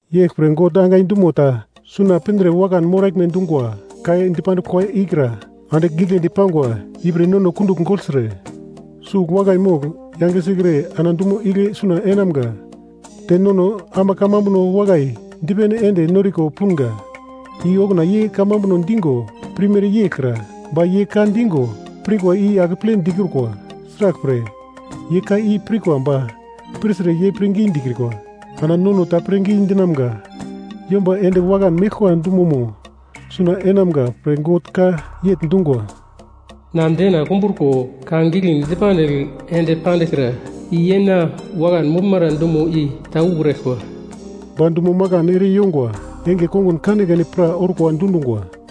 Yeglpre God angai dumo ta suna pindre wakan moraglme dungwa ka dipandiglmo ikra andigl giglendi pangwa, ipre nono kundugl gogltre, sugl wakai mogl yange sikre ana dumo igle suna enamga. Te nono ama kamambuno wakai dipene ende noriko punga, i okuna ye kamambuno digo pirmere yeglkra. Ba ye ka digo pirkwa i akeple dikrukwa. Sraglpre, ye ka i pirkwa ba pirtre ye pirngi dikrukwa. Ana nono ta pirngi dinamga yomba ende wakan meglkwa dumomo suna enamga pre God ka yegl dungwa, “Na dena kumbruko ka giglendi dipandigl ende pandiglkra i ‘ye na wakan moglmara dumo i ta ukraglkwa.’” Ba dumo makan ere yongwa enge kongun kanekane pra orkwa dundungwa.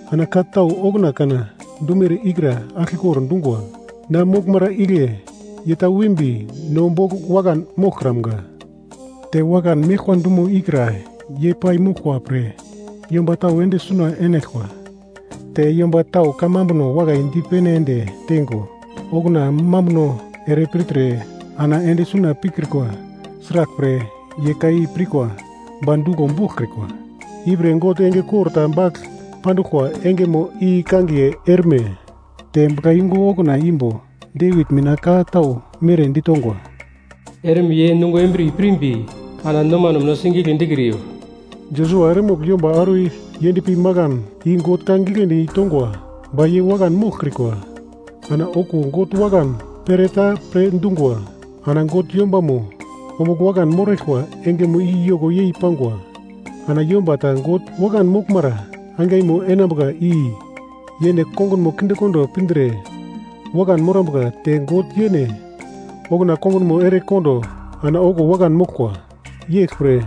Ana ka tau okuna kana dumere i kra aglkekor dungwa, na moglmara igle ye ta wimbi no bogl wakan moglkramga. Te wakan meglkwa dumo ikra yei pai moglkwa pre, yomba tau ende suna enaglkwa, te yomba tau kamambuno wakai dipene ende teingo okuna mambuno ere pirtre ana ende suna pikrikwa, sraglpre, ye ka i pirkwa ba duglo boglkrikwa. Ipre God enge kor ta bagl panduglkwa engemo i kangiye, “Erme”. Te buglayungu okuna imbo Devit mina ka tau mere ditongwa: “Erme ye nungo embriye pirmbi, ana nomano mina sigigle dikriyo.” Josua eremogl yomba auro yendpi makan i God ka giglendi tongwa ba ye wakan moglkrikwa. Ana okuwo God wakan pere ta pre dungwa. Ana God yombamo ombugl wakan moraglkwa engemo i yoko yei pangwa. Ana yomba ta God wakan moglmara angaimo enambuka i yene kongunmo kindekondo pindre wakan morambuka, te God yene okuna kongunmo ere kondo ana okuwo wakan moglkwa. Yeglpre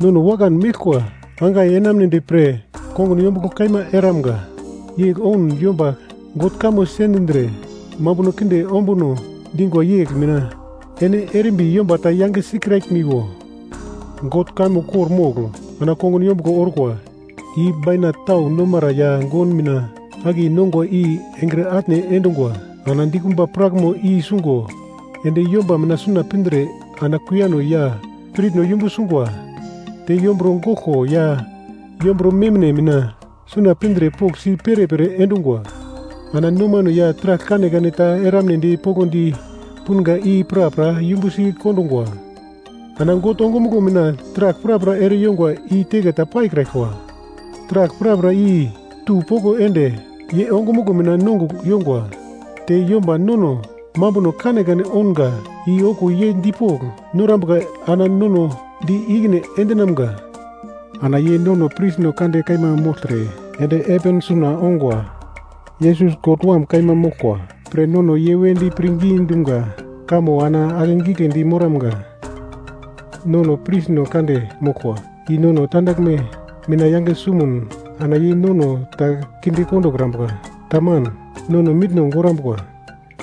nono wakan meglkwa angai enamunedi pre kongun yombuglo kaima eramga. Yegl oun yomba God kamo sendindre mambuno kinde ombuno dingwa yegl mina ene erimbi yomba ta yange sikraglimiwo. God kamo kor-mogl ana kongun yombuglo orkwa. I bainat tau nomara ya gon mina akiye nongwa i engre atne endungwa. Ana dikumba prakmo i sungo ende yomba mina suna pindre ana kuiyano ya spiritno yumbu sungwa, te yomburo goglko ya yomburo memine mina suna pindre poglsi perepere endungwa, ana nomano ya taragl kanekane ta eramnedi poglodi punga i prapra yumbu sikondungwa. Ana God ongumuglo mina taragl prapra ereyongwa i teke ta paikraglkwa, taragl prapra i tu poko ende ye ongumuglo mina nongugl yongwa. Te yomba nono mambuno kanekane ounga i okuwo ye dipogl norambuka ana nono di ikine endinamga. Ana ye nono prisno kande kaima mogltre ende heven suna ongwa. Yesus, God Wam kaima moglkwa pre nono ye wedi pirngi dumga kamo ana akegiglendi moramga. Nono prisno kande moglkwa i nono tandaglme mina yange sumun, ana ye nono ta kinde kondokrambuka, taman, nono mitno gorambuka.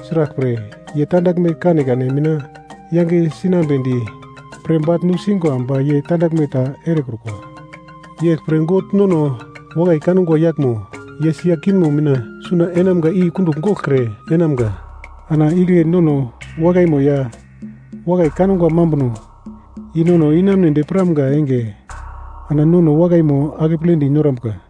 Sraglpre, ye tandaglme kanekane mina yange sinambedi pre bagl nusingwa ba ye tandaglme ta erekrukwa. Yeglpre God nono wakai kangwa yaglmo ye sia kingmo mina suna enamga i kundugl goglkre enamga. Ana igle nono wakaimo ya wakai kangwa mambuno i nono inamunedi piramga enge ana nono wakaimo akepledi norambuka.